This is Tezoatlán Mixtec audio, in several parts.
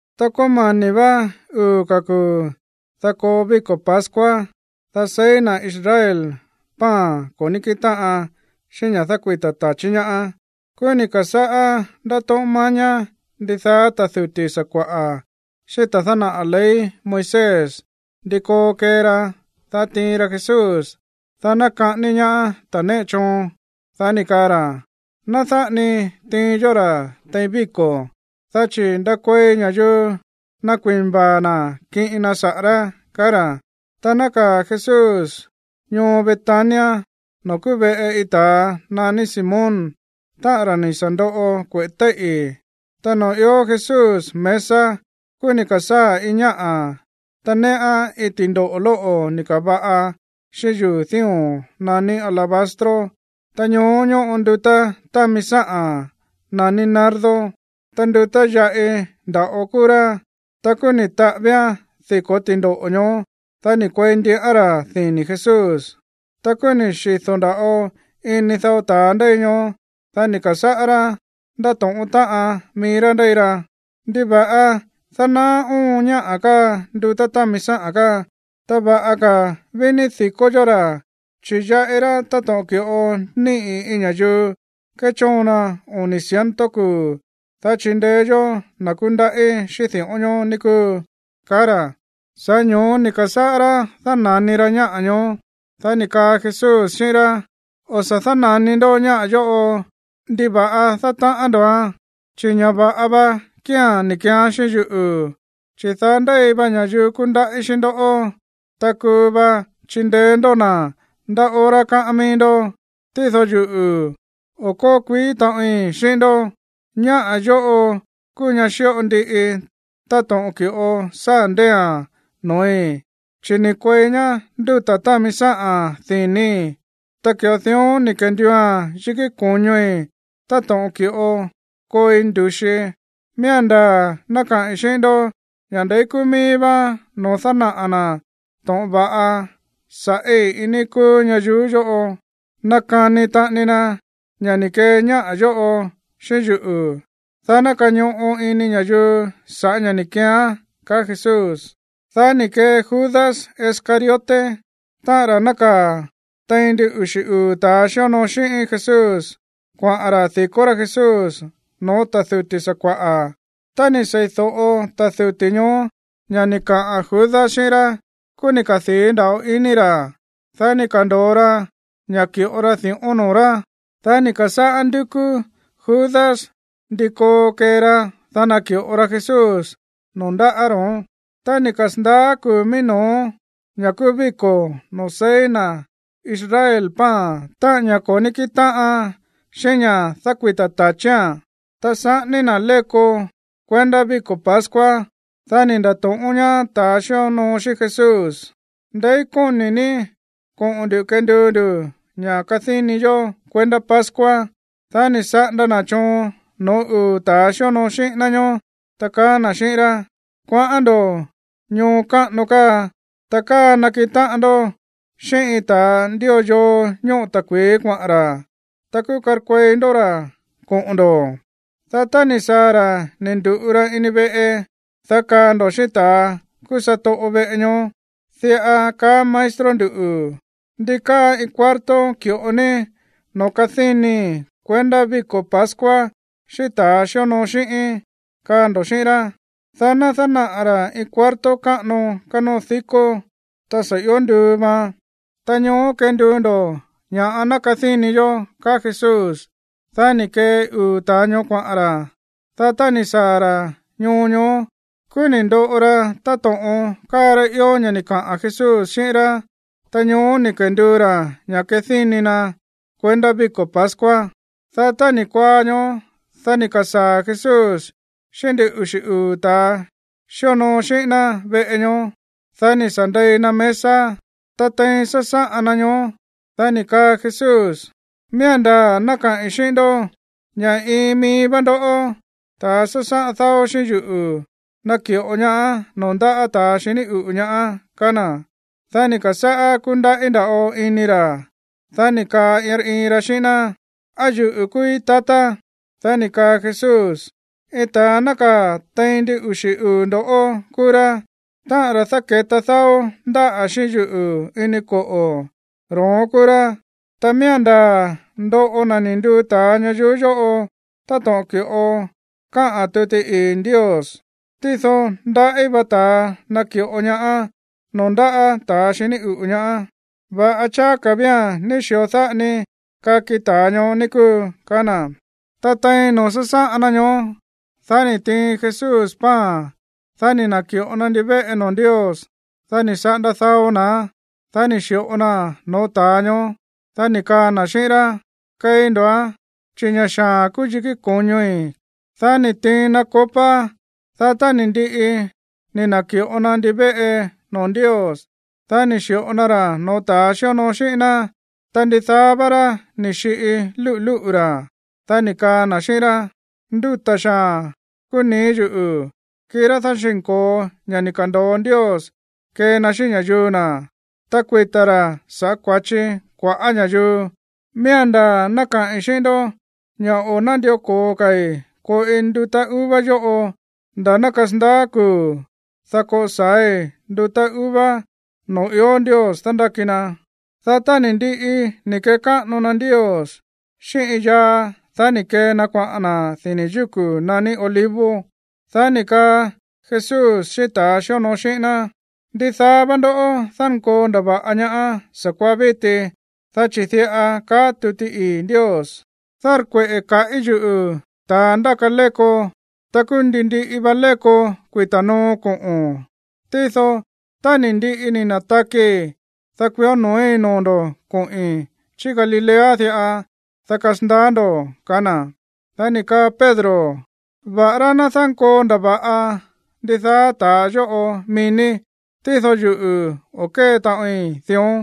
Ta kómani̱ vá uu̱ ka̱ kuu̱, dá koo víko̱ pascua, dá seí na̱ Israel pan ko̱ ní kíꞌin táꞌan xíꞌín ña̱ dákuita̱ ta̱chí ñaá. Kúú ni̱ ka̱sáꞌá ndátóꞌón mañá ndidaá ta̱ duti̱ sakua̱ꞌa̱ xíꞌín ta̱a dánaꞌa̱ ley Moisés ndi koo kee ra, dá tiin ra Jesús, dá ná kaꞌání ñaá ta̱ néꞌe choon. Dá ni̱ kaa ra̱: ―Ná dáꞌa ni tiin yó ra̱ tein víko̱, dá chi̱ ndakuei ña̱yuu nakui̱na vaa̱ na̱ kiꞌin na saꞌa̱ rá ―kaá ra̱. Ta nákaa̱ Jesús ñoo Betania noo̱ kúú veꞌe iin ta̱a naní Simón, táꞌa̱n ra̱ ni̱ sa̱ ndoꞌo kueꞌe̱ téíꞌi̱. Ta noo̱ ió Jesús mesa, kúú ni̱ ka̱sáa̱ iin ñáꞌa̱, ta néꞌán iin ti̱ndoꞌo̱ lóꞌo̱ ni̱ ka̱va̱ꞌa xíꞌín yuu̱ dío̱n naní alabastro. Ta ñoó ñóꞌo ndutá támi sáꞌa̱n naní nardo. Ta ndutá yaꞌi nda̱ꞌo kúú rá. Ta kúú ni̱ taꞌávíán diko̱ ti̱ndoꞌo̱ ñoó, dá ni̱ kuei ndiꞌán ra̱ dini̱ Jesús. Ta kúú ni̱ xido̱ nda̱ꞌo ini dao ta̱a ndéi ñoó, dá ni̱ ka̱sáꞌá rá ndátóꞌón táꞌan mií rá ndéi ra: ―¿Ndiva̱ꞌa dánaá oon ñáꞌa̱ káa ndutá támi sáꞌa̱n káa? Ta va̱ꞌa ka̱ ví ní di̱kó yó ra̱, chi̱ yaꞌi rá táto̱ꞌon ki̱ꞌo níꞌi̱ iin ña̱yuu kéchóon na oni̱ ciento kuu̱, dá chindeé yó na̱ kúndaꞌí xíꞌín di̱ꞌón ñoó, ní kúu ―kaá ra̱. Sa̱ꞌá ño̱ó ni̱ ka̱sáꞌá rá dána̱ni ra ñáꞌa̱ ñoó. Dá ni̱ kaa Jesús xíꞌín rá: ―O̱ sa̱ dána̱ni ndó ñáꞌa̱ yóꞌo. ¿Ndiva̱ꞌa dátaꞌán ndo̱án? Chi̱ ña̱ va̱ꞌa va kía̱n ni̱ keeán xíꞌín yuꞌu̱. Chi̱ daá ndéi va ña̱yuu kúndaꞌí xíꞌín ndoꞌó, ta kuu va chindeé ndó na̱ ndá hora káꞌán mií ndó. Tído yuꞌu̱, o̱ kóo kuií taꞌoin xíꞌín ndó. Ñáꞌa̱ yóꞌo kúú ñá xíꞌo ndiꞌi táto̱ꞌon ki̱ꞌo sáa̱ ndée̱a̱n noo̱í, chi̱ ni̱ kuei ñá ndutá támi sáꞌa̱n dini̱í, ta ki̱ꞌo dión ni̱ kenduua̱n yikí ko̱ñoi̱ táto̱ꞌon ki̱ꞌo kooi ndu̱xii. Miía̱n ndaa̱ ná kaꞌi̱n xíꞌín ndó ña̱ ndeí kúú míí vá noo̱ dánaꞌa̱ na̱ to̱ꞌon va̱ꞌa sa̱ꞌí iin níí kúú ñayuú yóꞌo, nakani taꞌani na ña̱ ni̱ kee ñáꞌa̱ yóꞌo xíꞌín yuꞌu̱, dá ná kañoꞌo ini ña̱yuu sa̱ꞌá ña̱ ni̱ keeán ―ka̱á Jesús. Dá ni̱ kee Judas Iscariote, táꞌa̱n ra̱ nákaa̱ tein ndin uxi̱ uu̱ ta̱a xíonoo xíꞌín Jesús, kuaꞌa̱n ra̱ di̱kó rá Jesús no̱ó ta̱ duti̱ sakua̱ꞌa̱. Tá ni̱ sei̱do̱ꞌo ta̱ duti̱ ñoó ña̱ ni̱ kaꞌa̱n Judas xíꞌín rá, kúú ni̱ kadii̱ nda̱ꞌo ini ra̱. Dá ni̱ ka̱ndo̱o ra ña̱ ki̱ꞌo ra di̱ꞌón noo̱ rá. Dá ni̱ ka̱sáꞌá ndúkú Judas ndí koo kee ra, dá naki̱ꞌo ra Jesús noo̱ ndáꞌa̱ ro̱ón. Tá ni̱ kasa̱ndaá kuu̱ mií no̱ó, ña̱ kúú víko̱ noo̱ seí na̱ Israel pan, táꞌa̱n ña̱ ko̱ ní kíꞌin táꞌan xíꞌín ña̱ dákuita̱ ta̱chía̱n, ta saꞌání na̱ léko kuendá víko̱ pascua, dá ni̱ nda̱to̱ꞌón ñaá ta̱ xíonoo xíꞌín Jesús: ―¿Ndeí kóni̱ ní koꞌo̱n nduꞌu̱ kenduu ndu̱ ña̱ kadíni yó kuendá pascua? Dá ni̱ saꞌanda na̱ choon no̱ó uu̱ ta̱ xíonoo xíꞌín ná ñóó, ta kaá na̱ xíꞌín rá: ―Kuaꞌán ndo̱ ñoo káꞌano káa. Ta káa nakiꞌin táꞌan ndó xíꞌín iin ta̱a ndío yoo ñóꞌo ta̱kui̱í kuaꞌa̱n ra̱. Ta kúú karkuei ndó ra̱ koꞌo̱n ndo̱. Dá tá ni̱ saa̱ ra̱ ni̱ ndu̱ꞌu ra ini veꞌe, dá kaa ndo̱ xíꞌín ta̱a kúú satoꞌo veꞌe ñoó: “Diꞌa kaá maestro nduꞌu̱: ¿Ndi káa iin cuarto ki̱ꞌo ní noo̱ kadínii̱ kuendá víko̱ pascua xíꞌín ta̱ xíonoo xíꞌíín?” kaa ndo̱ xíꞌín rá. Dá ná dánaꞌa̱ ra̱ iin cuarto káꞌano kánóo dikó, ta sa̱ ió nduu vaan. Ta ñoó kenduu ndo̱ ña̱ꞌa ná kadíni yó ―kaá Jesús. Dá ni̱ kee uu̱ ta̱a ñoó kuaꞌa̱n ra̱. Dá tá ni̱ saa̱ ra̱ ñoo ñoó, kúú ni̱ ndoꞌo ra táto̱ꞌon káa rá ió ña̱ ni̱ kaꞌa̱n Jesús xíꞌín rá. Ta ñoó ni̱ kenduu ra̱ ña̱ kadíni na kuendá víko̱ pascua. Dá tá ni̱ kuaá ñóó, dá ni̱ ka̱saa̱ Jesús xíꞌín ndin uxi̱ uu̱ ta̱ xíonoo xíꞌín ná veꞌe ñoó. Dá ni̱ sa̱ ndei na mesa. Ta tein sásáꞌan na ñoó, dá ni̱ kaa Jesús: ―Miía̱n ndaa̱ ná kaꞌi̱n xíꞌín ndó ña̱ iin mií vá ndoꞌó, ta̱ sásáꞌan dáó xíꞌín yuꞌu̱, naki̱ꞌo ñaá noo̱ ndáꞌa̱ ta̱a xiní uꞌu̱ ñaá ―kaá na̱. Dá ni̱ ka̱sáꞌá kúndaꞌí nda̱ꞌo ini ra̱. Dá ni̱ kaa iin rá iin ra xíꞌín ná: ―¿Á yuꞌu̱ kúúí, tatá? Dá ni̱ kaa Jesús: ―Iin ta̱a nákaa̱ tein ndin uxi̱ uu̱ ndo̱ kúú rá. Táꞌa̱n ra̱ dáke̱ta dáó ndáꞌa̱ xíꞌín yuꞌu̱ ini koꞌo̱, ro̱ón kúú rá. Ta miía̱n ndaa̱ ndoꞌo na̱ ni̱ nduu ta̱a ñayuú yóꞌo táto̱ꞌon ki̱ꞌo káꞌa̱n tuti ii̱ Ndios. Tído ndaꞌí va ta̱a naki̱ꞌo ñaá noo̱ ndáꞌa̱ ta̱a xiní uꞌu̱ ñaá. Va̱ꞌa cháá ka̱ vía̱n ní xi̱o dáꞌa ni kaki ta̱a ñoó, ní kúu ―kaá na̱. Ta tein noo̱ sásáꞌan na ñoó, dá ni̱ tiin Jesús pan. Dá ni̱ na̱ki̱ꞌo na ndivéꞌe noo̱ Ndios. Dá ni̱ saꞌanda dao naa̱n, dá ni̱ xi̱ꞌo naa̱n no̱ó ta̱a ñoó. Dá ni̱ kaa na̱ xíꞌín rá: ―Keí ndo̱án, chi̱ ña̱ xaa̱n kúú yikí ko̱ñoi̱. Dá ni̱ tiin na copa. Dá tá ni̱ ndiꞌi ni̱ na̱ki̱ꞌo na ndivéꞌe noo̱ Ndios, dá ni̱ xi̱ꞌo na ra̱ no̱ó ta̱ xíonoo xíꞌín ná, ta ndidaá vá rá ni̱ xiꞌi lúꞌu̱ lúꞌu̱ ra̱. Dá ni̱ kaa na̱ xíꞌín rá: ―Ndúta̱ xaa̱n kúú nii̱ yuꞌu̱, kirá dáxi̱nko̱o ña̱ ni̱ ka̱ndo̱o Ndios kee na xíꞌín ña̱yuu na̱, ta kuita̱ ra̱ sa̱ꞌá kua̱chi kua̱ꞌá ña̱yuu. Miía̱n ndaa̱ ná kaꞌi̱n xíꞌín ndó ña̱ o̱ nándió ko̱o ka̱i̱ koꞌi ndutá uva yóꞌo nda̱ ná kasandaá kuu̱, dá koꞌo sa̱ái̱ ndutá uva noo̱ ió Ndios dándáki na. Dá tá ni̱ ndiꞌi ni̱ kekáꞌano na Ndios xíꞌín iin yaa, dá ni̱ kee na kuaꞌa̱n na̱ dini̱ yúku̱ naní Olivos. Dá ni̱ kaa Jesús xíꞌín ta̱ xíonoo xíꞌín ná: ―Ndidaá vá ndoꞌó dánkoo ndava̱ꞌa ñaá sa̱kuaá víti, dá chi̱ diꞌa kaá tuti ii̱ Ndios: “Dárkueꞌe̱ kaꞌí yuꞌu̱ ta̱a ndáka léko, ta kúú ndi ndiꞌi va léko kuita̱ no̱ó koꞌo̱n.” Tído tá ni̱ ndiꞌi ni̱ na̱takii̱, dá kuió no̱ói̱ noo̱ ndo̱ koꞌi̱n chí Galilea diꞌa, dá kasandaá ndo̱ ―kaá na̱. Dá ni̱ kaa Pedro: ―Va̱ꞌará ná dánkoo ndava̱ꞌa ndidaá ta̱a yóꞌo mií ní, tído yuꞌu̱, o̱ kée taꞌoin dión.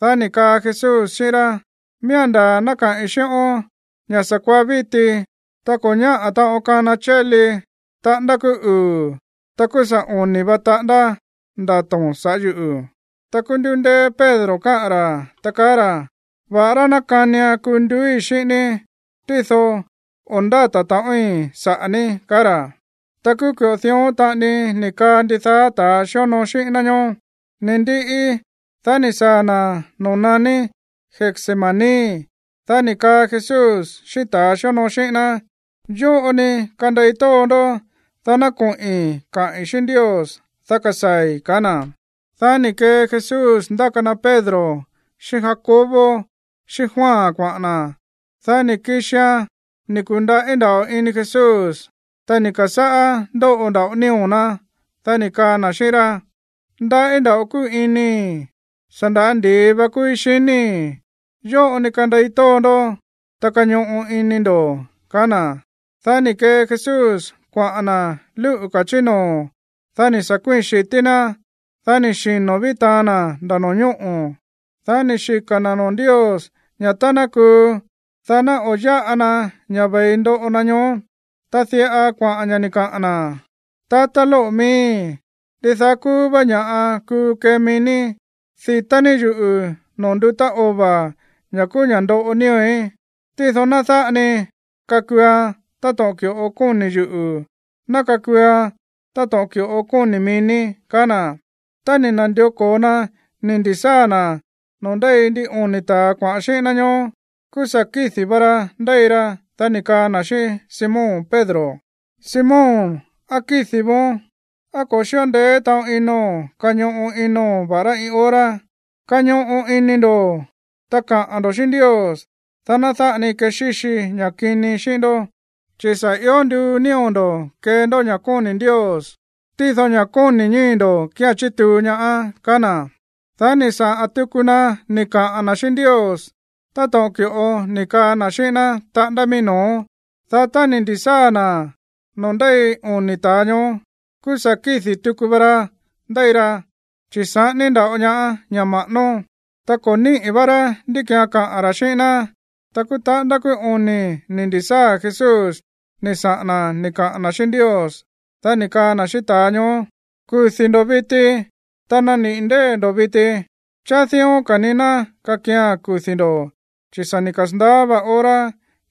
Dá ni̱ kaa Jesús xíꞌín rá: ―Miía̱n ndaa̱ ná kaꞌi̱n xíꞌón ña̱ sa̱kuaá víti, tá ko̱ ñáꞌa̱ taꞌon kana chéli taꞌándá kúú uu̱, ta kúú sa̱ oni̱ va taꞌándá ndato̱n sa̱ꞌá yuꞌu̱. Ta kúú ni̱ ndu̱ndéé Pedro kaꞌa̱n ra̱, ta kaá ra̱: ―Va̱ꞌará ná kánian kuu nduúi̱ xíꞌín ní, tído o̱ ndáta̱ taꞌoin saꞌa̱ ní ―kaá ra̱. Ta kúú ki̱ꞌo dión taꞌani ni̱ kaa ndidaá ka̱ ta̱ xíonoo xíꞌín ná ñóó. Ni̱ ndiꞌi, dá ni̱ saa̱ na̱ noo̱ naní Getsemaní. Dá ni̱ kaa Jesús xíꞌín ta̱ xíonoo xíꞌín ná: ―Yóꞌo ni kandei tóo ndó, dá ná koꞌi̱n kaꞌi̱n xíꞌín Ndios, dá kasaa̱i̱ ―ka̱á na̱. Dá ni̱ kee Jesús ndáka na Pedro xíꞌín Jacobo xíꞌín Juan kuaꞌa̱n na̱. Dá ni̱ kixia̱n ni̱ ku̱ndaꞌí nda̱ꞌo ini Jesús, ta ni̱ ka̱sáꞌá ndóꞌo nda̱ꞌo nío̱ ná. Dá ni̱ kaa na̱ xíꞌín rá: ―Ndaꞌí nda̱ꞌo kúu inii̱. Sa̱ nda̱á ndi̱i va kúúí xiníi̱. Yóꞌo ni kandei tóó ndó, ta kañoꞌo ini ndo̱ ―kaá na̱. Dá ni̱ kee Jesús kuaꞌa̱n na̱ lúꞌu̱ ka̱ chí noo̱. Dá ni̱ sa̱ kuíi̱n xi̱tí ná, ta ni̱ xino̱ ví taan na̱ nda̱ no̱ñóꞌo̱. Dá ni̱ xika̱ na̱ noo̱ Ndios ña̱ tá ná kuu, dá ná o̱ yáꞌa na ña̱ ve̱i ndoꞌo na ñoó. Ta diꞌa kuaꞌa̱n ña̱ ni̱ kaa na̱: ―Tatá lóꞌo̱ miíi̱, ndidaá kúú vá ña̱ꞌa kuu kee mií ní. Di̱tá ní yuꞌu̱ noo̱ ndutá ova̱, ña̱ kúú ña̱ ndoꞌo nío̱í. Tído ná dáꞌa ni kakuuan táto̱ꞌon ki̱ꞌo kóni̱ yuꞌu̱. Ná kakuuan táto̱ꞌon ki̱ꞌo kóni̱ mií ní ―kaá na̱. Tá ni̱ na̱ndió ko̱o na ni̱ ndi̱sáa̱ na̱ noo̱ ndéi ndin oni̱ ta̱a kuaꞌa̱n xíꞌín ná ñoó, kúú sa̱ kídi̱ va ra ndéi ra. Dá ni̱ kaa na̱ xíꞌín Simón Pedro: ―Simón, ¿á kídi̱ vóón? ¿Á ko̱ xi̱ꞌo ndeé taꞌon inóo̱n kañoꞌo inóo̱n, va̱ꞌará iin hora? Kañoꞌo ini ndo̱, ta kaꞌa̱n ndo̱ xíꞌín Ndios, dá ná dáꞌa ni kexíxi ña̱ kini xíꞌín ndó. Chi̱ sa̱ ió nduu nío̱ ndo̱ kee ndó ña̱ kóni̱ Ndios. Tído ña̱ kóni̱ ñíi̱ ndo̱ kía̱n chituu ñaá ―kaá na̱. Dá ni̱ saꞌa̱n tuku na ni̱ kaꞌa̱n na̱ xíꞌín Ndios táto̱ꞌon ki̱ꞌo ni̱ kaꞌa̱n na̱ xíꞌín ná taꞌándá mií no̱ó. Dá tá ni̱ ndi̱sáa̱ na̱ noo̱ ndéi oni̱ ta̱a ñoó, kúú sa̱ kídi̱ tuku va ra ndéi ra, chi̱ saꞌání nda̱ꞌo ñaá ña̱ ma̱ꞌánó. Ta ko̱ níꞌi̱ vá rá ndí ki̱án kaꞌa̱n ra̱ xíꞌín ná. Ta kúú taꞌándá kúú oni̱ ni̱ ndi̱sáa̱ Jesús ni̱ saꞌa̱n na̱ ni̱ kaꞌa̱n na̱ xíꞌín Ndios. Dá ni̱ kaa na̱ xíꞌín ta̱a ñoó: ―¡Kudi̱ ndo̱ viti! ¡Ta naniꞌi̱ ndée̱ ndo̱ viti! Cháá dión ka̱ ni ná kakia̱n kudi̱ ndo̱, chi̱ sa̱ ni̱ kasa̱ndaá va hora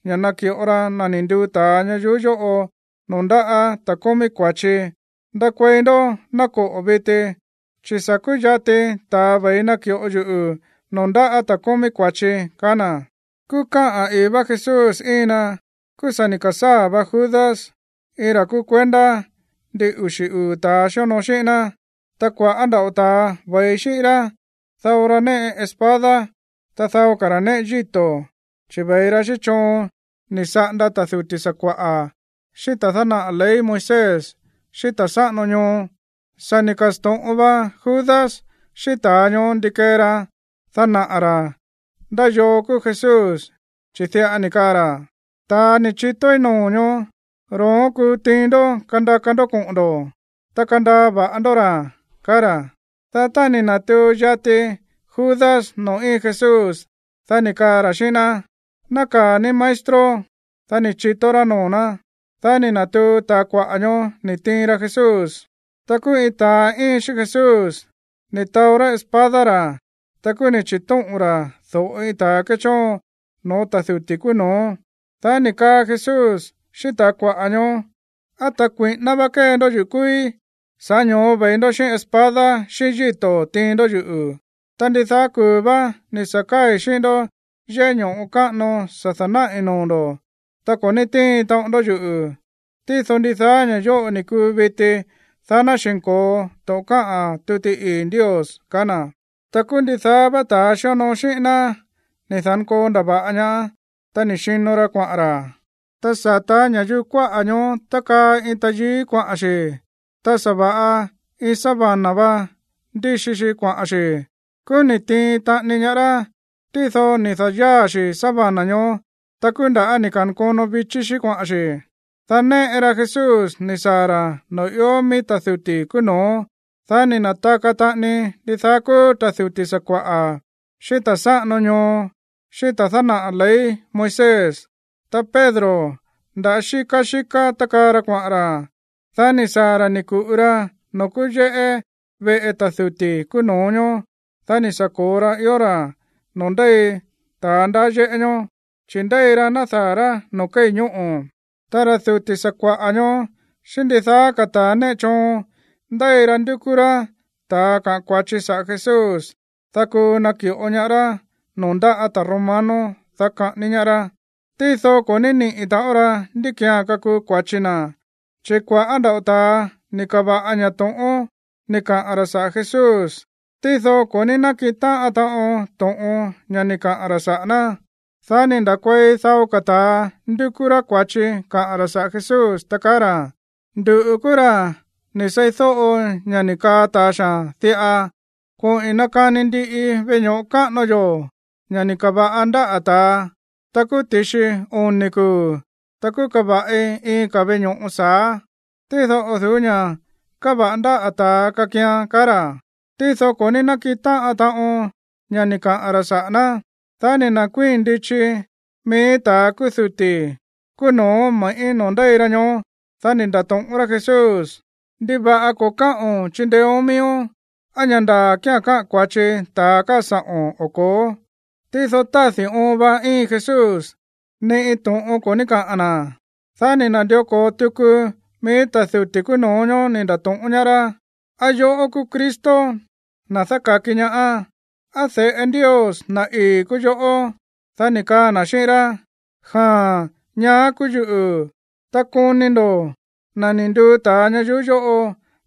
ña̱ naki̱ꞌo ra na̱ ni̱ nduu ta̱a ñayuú yóꞌo noo̱ ndáꞌa̱ ta̱a kómí kua̱chi. ¡Ndakuei ndó, ná koꞌo̱ viti! Chi̱ sa̱ kúyati ta̱a ve̱i naki̱ꞌo yuꞌu̱ noo̱ ndáꞌa̱ ta̱ kómí kua̱chi ―kaá na̱. Kúú káꞌa̱n i̱í vá Jesús íin na, kúú sa̱ ni̱ ka̱sáa̱ va Judas, iin ra̱ kúú kuendá ndin uxi̱ uu̱ ta̱ xíonoo xíꞌín ná. Ta kua̱ꞌá nda̱ꞌo ta̱a ve̱i xíꞌín rá. Dao ra néꞌe espada, ta dao ka̱ ra̱ néꞌe yíto̱. Chi̱ ve̱i ra xíꞌín choon ni̱ saꞌanda ta̱ duti̱ sakua̱ꞌa̱, xíꞌín ta̱a dánaꞌa̱ ley Moisés, xíꞌín ta̱ sáꞌano ñoo. Sa̱ ni̱ ka̱sto̱ꞌon va Judas xíꞌín ta̱a ñoó ndi kee ra dánaꞌa̱ ra̱ ndá yoo kúú Jesús, chi̱ diꞌa ni̱ kaa ra̱: ―Ta̱a ni̱ chitóí noo̱ ñoó, ro̱ón kúú tiin ndó kandaka ndó koꞌo̱n ndo̱, ta kandaa va̱ꞌa ndó ra̱ ―kaá ra̱. Dá tá ni̱ na̱tuu yati Judas noo̱ íin Jesús, dá ni̱ kaa ra̱ xíꞌín ná: ―Nákaa̱ ní, maestro. Dá ni̱ chitó rá noo̱ ná. Dá ni̱ na̱tuu ta̱a kuaꞌa̱ ñoó ni̱ tiin ra Jesús. Ta kúú iin ta̱a íin xíꞌín Jesús ni̱ taó rá espada ra̱. Ta kúú ni̱ chi̱tóꞌo̱n ra̱ do̱ꞌo iin ta̱a kéchóon no̱ó ta̱ duti̱ kúú no̱ó. Dá ni̱ kaa Jesús xíꞌín ta̱a kuaꞌa̱ ñoó: ―¿Á ta̱ kui̱ꞌíná vá kée ndó yuꞌu̱ kúúí, sa̱ꞌá ño̱ó ve̱i ndó xíꞌín espada xíꞌín yíto̱ tiin ndó yuꞌu̱? Ta ndidaá kuu̱ vá ni̱ sa̱ káa̱i̱ xíꞌín ndó yéꞌé ño̱ꞌo káꞌano sa̱ da̱náꞌi̱ noo̱ ndo̱, ta ko̱ ní tíin taꞌon ndó yuꞌu̱. Tído ndidaá ña̱ yóꞌo kúu viti, dá ná xi̱nko̱o to̱ꞌon káꞌa̱n tuti ii̱ Ndios ―kaá na̱. Ta kúú ndidaá vá ta̱ xíonoo xíꞌín ná ni̱ da̱nkoo ndava̱ꞌa ñaá, ta ni̱ xino ra kuaꞌa̱n ra̱. Ta sata̱ ña̱yuu kuáꞌa̱ ñoó tákaa iin tayií kuaꞌa̱n xi. Ta sa̱va̱ꞌa iin sábana va ndíxi xi kuaꞌa̱n xi̱. Kúú ni̱ tiin taꞌani ñaá rá. Tído ni̱ da̱yáa̱ xi̱ sábana ñoó. Ta kúú nda̱á ni̱ ka̱nkono vichí xí kuaꞌa̱n xi̱. Dá néꞌe ra Jesús ni̱ saa̱ ra̱ noo̱ ió mií ta̱ duti̱ kúú no̱ó. Dá ni̱ na̱taka taꞌani ndidaá kúú ta̱ duti̱ sakua̱ꞌa̱, xíꞌín ta̱ sáꞌano ñoo, xíꞌín ta̱a dánaꞌa̱ ley Moisés. Ta Pedro, nda̱á xíká xíká tákaa ra kuaꞌa̱n ra. Dá ni̱ saa̱ ra̱ ni̱ ku̱ꞌu ra noo̱ kúú yéꞌé veꞌe ta̱ duti̱ kúú no̱ó ñóó. Dá ni̱ sa̱ ko̱o ra ió ra̱ noo̱ ndéi ta̱a ndaá yéꞌé ñóó, chi̱ ndéi ra nádaa̱ rá noo̱ kéi̱ ñóꞌo̱. Ta ra̱ duti̱ sakua̱ꞌa̱ ñoó xíꞌín ndidaá ka̱ ta̱ néꞌe choon ndéi ra ndúkú rá ta̱a kaꞌa̱n kua̱chi saꞌa̱ Jesús, dá kuu naki̱ꞌo ñaá rá noo̱ ndáꞌa̱ ta̱ romano, dá kaꞌání ñaá rá. Tído ko̱ ní níꞌi̱ taꞌon ra ndí ki̱án kakuu kua̱chi na. Chi̱ kua̱ꞌá nda̱ꞌo ta̱a ni̱ ka̱va̱ꞌa ña̱ to̱ꞌón ni̱ kaꞌa̱n ra̱ saꞌa̱ Jesús. Tído ko̱ ní nákiꞌin táꞌan taꞌon to̱ꞌon, ña̱ ni̱ kaꞌa̱n ra̱ saꞌa̱ ná. Dá ni̱ nda̱kuei dao ka̱ ta̱a ndúkú rá kua̱chi kaꞌa̱n ra̱ saꞌa̱ Jesús, ta kaá ra̱: ―Nduꞌu̱ kúú ra̱ ni̱ seídóꞌo ña̱ ni̱ kaa ta̱a xaa̱n diꞌa: “Koꞌi̱n nakani ndiꞌii veꞌe ño̱ꞌo káꞌano yó, ña̱ ni̱ ka̱va̱ꞌa ndáꞌa̱ ta̱a. Ta kúú ti̱xi oni̱ kuu̱, ta kúú kava̱ꞌi iin ka̱ veꞌe ño̱ꞌo sa̱á, tído o̱ du̱ú ña̱ káva̱ꞌa ndáꞌa̱ ta̱a kakian” ―kaá ra̱. Tído ko̱ ní nákiꞌin táꞌan taꞌon ña̱ ni̱ kaꞌa̱n ra̱ saꞌa̱ ná. Dá ni̱ nda̱kuíi̱n ndichi mií ta̱ kúú duti̱ kúú no̱ó me̱ꞌí noo̱ ndéi ra ñoó. Dá ni̱ nda̱to̱ꞌón rá Jesús: ―¿Ndiva̱ꞌa ko̱ káꞌo̱n chindeéón miíón? ¿Á ña̱ ndaa̱ kía̱n káꞌa̱n kua̱chi ta̱a káa sa̱ꞌo̱n o ko̱ó? Tído tádi̱ óon va íin Jesús, ni iin to̱ꞌon ko̱ ní kaꞌa̱n na̱. Dá ni̱ na̱ndió ko̱o tuku mií ta̱ duti̱ kúú no̱ó ñóó ni̱ nda̱to̱ꞌón ñaá rá: ―¿Á yoꞌó kúú Cristo, na̱ dáka̱ki ñaá? ¿Á de̱ꞌe Ndios, na̱ ii̱, kúú yoꞌó? Dá ni̱ kaa na̱ xíꞌín rá: ―Jaa̱n, ñaá kúú yuꞌu̱, ta koni ndo̱ na̱ ni̱ nduu ta̱a ñayuú yóꞌo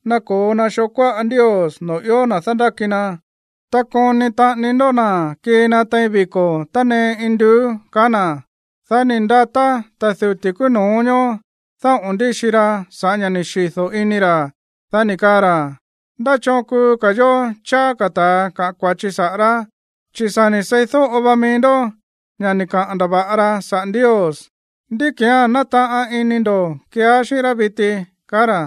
nako̱o na xoo kuáꞌa Ndios noo̱ ió na̱ dándáki na. Ta koni taꞌani ndó na̱ kii na tein viko̱ tánee induú ―kaá na̱. Dá ni̱ ndatá ta̱ duti̱ kúú no̱ó ñóó dáꞌo̱n ndíxi ra sa̱ꞌá ña̱ ni̱ xido̱ ini ra̱. Dá ni̱ kaa ra̱: ―¿Ndá choon kuu ka̱ yo̱ cháá ka̱ ta̱a kaꞌa̱n kua̱chi saꞌa̱ rá? Chi̱ sa̱ ni̱ seídóꞌo vá míí ndó ña̱ ni̱ kaꞌa̱n ndava̱ꞌa ra saꞌa̱ Ndios. ¿Ndí ki̱án nátaꞌan ini ndo̱ keeá xíꞌín rá viti? ―kaá ra̱.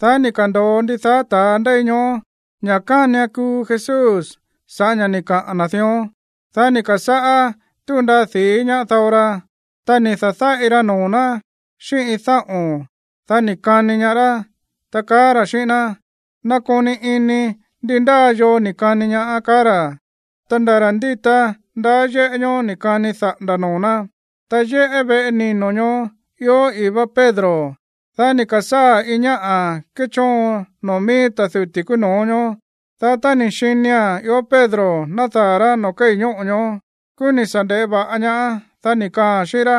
Dá ni̱ ka̱ndo̱o ndidaá ta̱a ndéi ñoó ña̱ kánian kuu Jesús sa̱ꞌá ña̱ ni̱ kaꞌa̱n na̱ dión. Dá ni̱ ka̱sáꞌá túu ndaa di̱í ñaá dao ra. Ta ni̱ da̱dáꞌi ra noo̱ ná xíꞌín iin dáꞌo̱n, dá ni̱ kani ñaá rá, ta kaá ra̱ xíꞌín ná: ―Nakoni ini ndi ndá yoo ni̱ kani ñaá ―kaá ra̱. Ta nda̱ ra̱ ndíta ndaá yéꞌé ñoó ni̱ kani daꞌa̱nda̱ noo̱ ná. Ta yéꞌé veꞌe nino̱ ñoó ió i̱í vá Pedro. Dá ni̱ ka̱sáa̱ iin ñáꞌa̱ kéchóon noo̱ mií ta̱ duti̱ kúú no̱ó ñoó. Dá tá ni̱ xinia̱n ió Pedro nádaa̱ rá noo̱ kéi̱ ñóꞌo̱ ñoó, kúú ni̱ sa̱ nde̱ꞌé va̱ꞌa ñaáán, dá ni̱ kaaa̱n xíꞌín rá: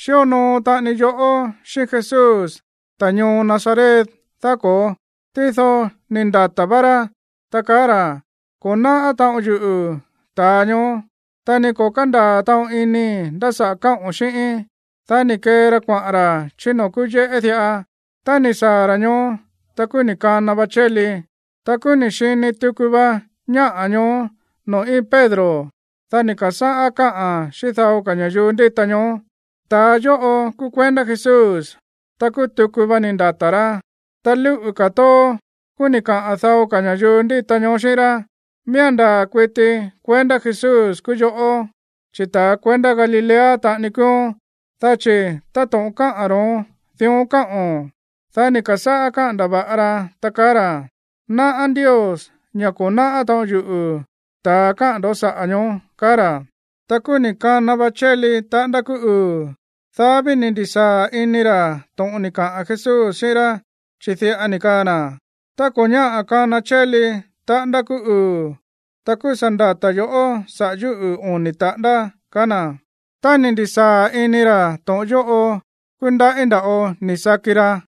―Xíonoo taꞌani yoꞌó xíꞌín Jesús, ta̱ ñoo Nazaret, ¿daá ko̱ó? Tído ni̱ ndata̱ vá rá, ta kaá ra̱: ―Ko̱ náꞌá taꞌon yuꞌu̱ ta̱a ñoó, ta ni ko̱ kándaa̱ taꞌon inii̱ ndá saꞌa̱ káꞌo̱n xíꞌíín. Dá ni̱ kee ra kuaꞌa̱n ra̱ chí noo̱ kúú yéꞌé diꞌa. Tá ni̱ saa̱ ra̱ ñoó, ta kúú ni̱ kana va chéli. Ta kúú ni̱ xini tuku va ñáꞌa̱ ñoó noo̱ íin Pedro. Dá ni̱ ka̱sáꞌá káꞌa̱n xíꞌín dao ka̱ ña̱yuu ndíta ñoó: ―Ta̱a yóꞌo kúú kuendá Jesús. Ta kúú tuku va ni̱ ndata̱ rá. Ta lúꞌu̱ ka̱ tóó, kúú ni̱ kaꞌa̱n dao ka̱ ña̱yuu ndíta ñoó xíꞌín rá: ―Miía̱n ndaa̱ kuiti kuendá Jesús kúú yoꞌó, chi̱ ta̱ kuendá Galilea taꞌani kúúón. Dá chi̱ táto̱ꞌon káꞌa̱n ro̱ón, dión káꞌo̱n. Dá ni̱ ka̱sáꞌá káꞌa̱n ndava̱ꞌa Pedro, ta kaá ra̱: ―Náꞌá Ndios ña̱ ko̱ náꞌá taꞌon yuꞌu̱ ta̱a káꞌa̱n ndo̱ saꞌa̱ ñoó ―kaá ra̱. Ta kúú ni̱ kana va chéli taꞌándá kúú uu̱. Dá ví ni̱ ndi̱sáa̱ ini ra̱ to̱ꞌon ni̱ kaꞌa̱n Jesús xíꞌín rá, chi̱ diꞌa ni̱ kaa na̱: “Tá ko̱ ñáꞌa̱ kana chéli taꞌándá kúú uu̱, ta kúú sa̱ ndata̱ yo̱ꞌó sa̱ꞌá yuꞌu̱ oni̱ taꞌándá”, kaá na̱. Tá ni̱ ndi̱sáa̱ ini ra̱ to̱ꞌon yóꞌo, kúú ndaꞌí nda̱ꞌo ni̱ saki ra.